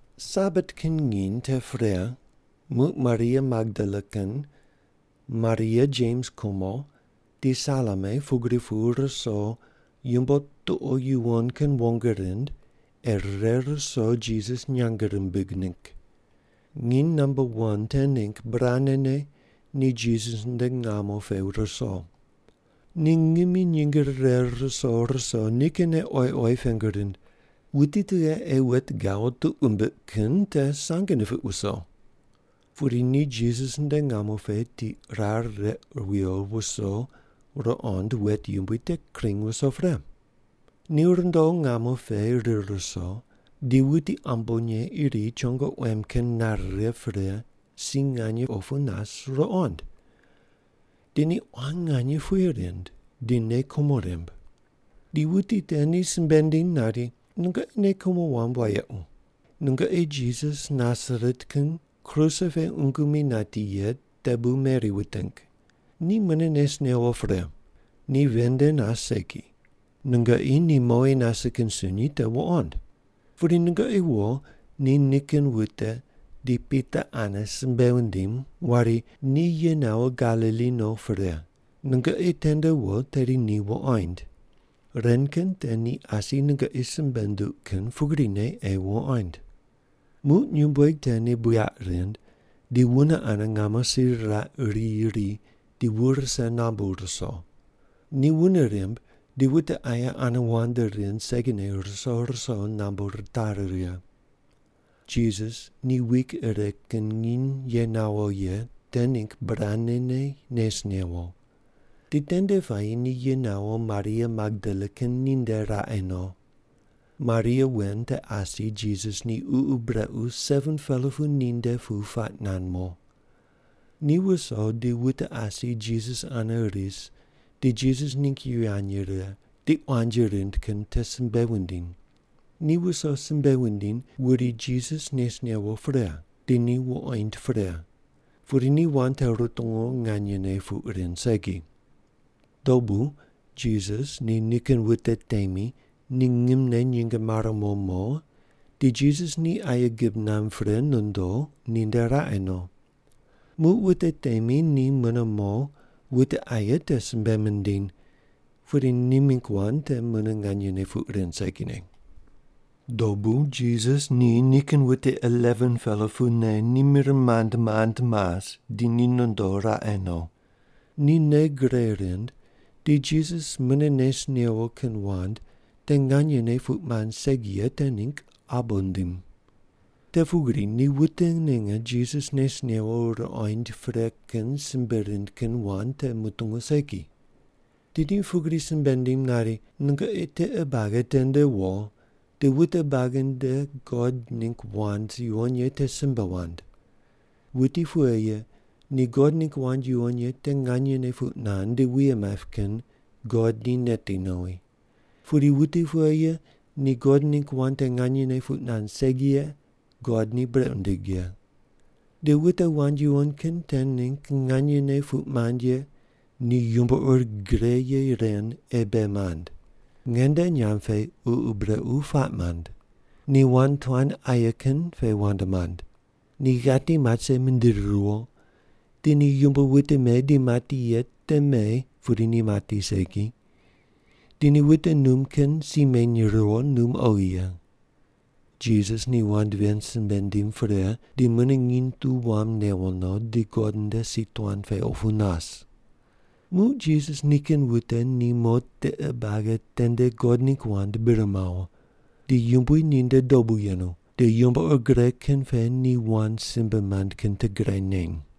Sabat kin nginy te pre muq Maria Magdala kin, Maria Jems kumo di Salome pugri pu ruso yumbo tuqo yuwon kin wong rind ei rire ruso Jisas nyang rimbig ningg. Nginy namba wan te ningg burane ni Jisas nde ngamo pe ruso. Ni ngimi nyinge rire ruso ruso nikinne oyi oyi pengu rind, “Wuti tughe ei wet gawo tuq wumbiq kin te sange nipiq wuso?” Pudi ni Jisas nde ngamo pe tiq rar req wiyo wuso ruqond wet yumbui te kring wuso pre. Ni rundo ngamo pe rir ruso di wuti ambonye iri chongo quem kin nare righe pre si nganye opu nas ruqoind. Di ni quan nganye puye rind di nei kumo rimb. Di wuti te ni simbe nindiny nari, “Nungoqi nei kumo wamb wayequ. Nungoqi Jisas Nasaret kin kruse pe qungu mi nati ye te bu meri wuting. Ni mune nes newo pre. Ni ven nde nas segi. Nungoqi ni mowi nase kin sunyi te wuqond. Pudi nungoqi wo ni nikin wute di Pita ane simbe wundim wari, ‘Ni ye nawo Galili no pre. Nungoqi tende wo tedi ni wuqoind. Ren kin te ni asi nungoqi simbe nunduq kin pugrine ei wuqoind’.” Muq nyumbueg te ni buyaq rind di wune ane ngamo si riraq riyi ri di wu rise nambu ruso. Ni wune rimb di wute aye ane wand rind segine ruso ruso nambu ritari righe. Jisas ni wik ire kin nginy ye nawo ye te ningg burane nes newo. Di tende puayi ni ye nawo Maria Magdala kin ninde raqe no. Maria wen te asi Jisas ni ququ brequ 7-pela pu ninde pu puaq nand mo. Ni wuso di wute asi Jisas ane ris di Jisas ningg yivany rire di quanji rind kin te simbe wundiny. Ni wuso simbe wundiny wuri Jisas nes newo pre di ni wuqoind pre, pudi ni wand te rutungu nganyene puq rind segi. Dobu Jisas ni nikin wute temi ni ngimne nyinge mare mo mo di Jisas ni aye gib namb pre nondo ninde raqe no. Muq wute temi te mune mo wute aye te simbe mindiny, pudi ni mingg wand te mune nganyene puq rind segine. Dobu Jisas ni nikin wute 11-pela pune ni mir mand mand mas di ni nondo raqe no. Ni nei gre rind di Jisas mune nes newo kin wand te nganyene puq mand segi ye te ningg abo nindim. Te pugri ni wute ninge Jisas nes newo ruqoind pre kin simbe rind kin wand te mutungu segi. Di ni pugri simbe nindim nari, “Nungoqi tiqe buagi tende wo di wute buagi nde God ningg wand yuwon ye te simbe wand. Wuti pughe ye ni God ningg wand yuwon ye te nganyene puq nand di wuye maip kin God ni neti nowi. Pudi wuti pughe ye ni God ningg wand te nganyene puq nand segi ye God ni brequ nindig ye. Di wute wand yuwon kin te ningg nganyene puq mand ye ni yumbo ur gre ye ren ei ni bei mand: Nge nde nyamb pe ququ brequ puaq mand. Ni wand tuan aye kin pe wand mand. Ni ghati mat rise mindiri riwo di ni yumbo wute me di mati ye te me pudi ni mati segi, di ni wute num kin si meny riwo num oghi ye.” Jisas ni wand ven simbe nindim pre di mune nginy tu wam newo no di God nde si tuan pe opu nas. Muq Jisas nikin wute ni mo tiqe buagi tende God ningg wand bir mawo. Di Yumbui ninde dobu yenu di yumbo ur gre kin pe ni wand simbe mand kin te gre neny.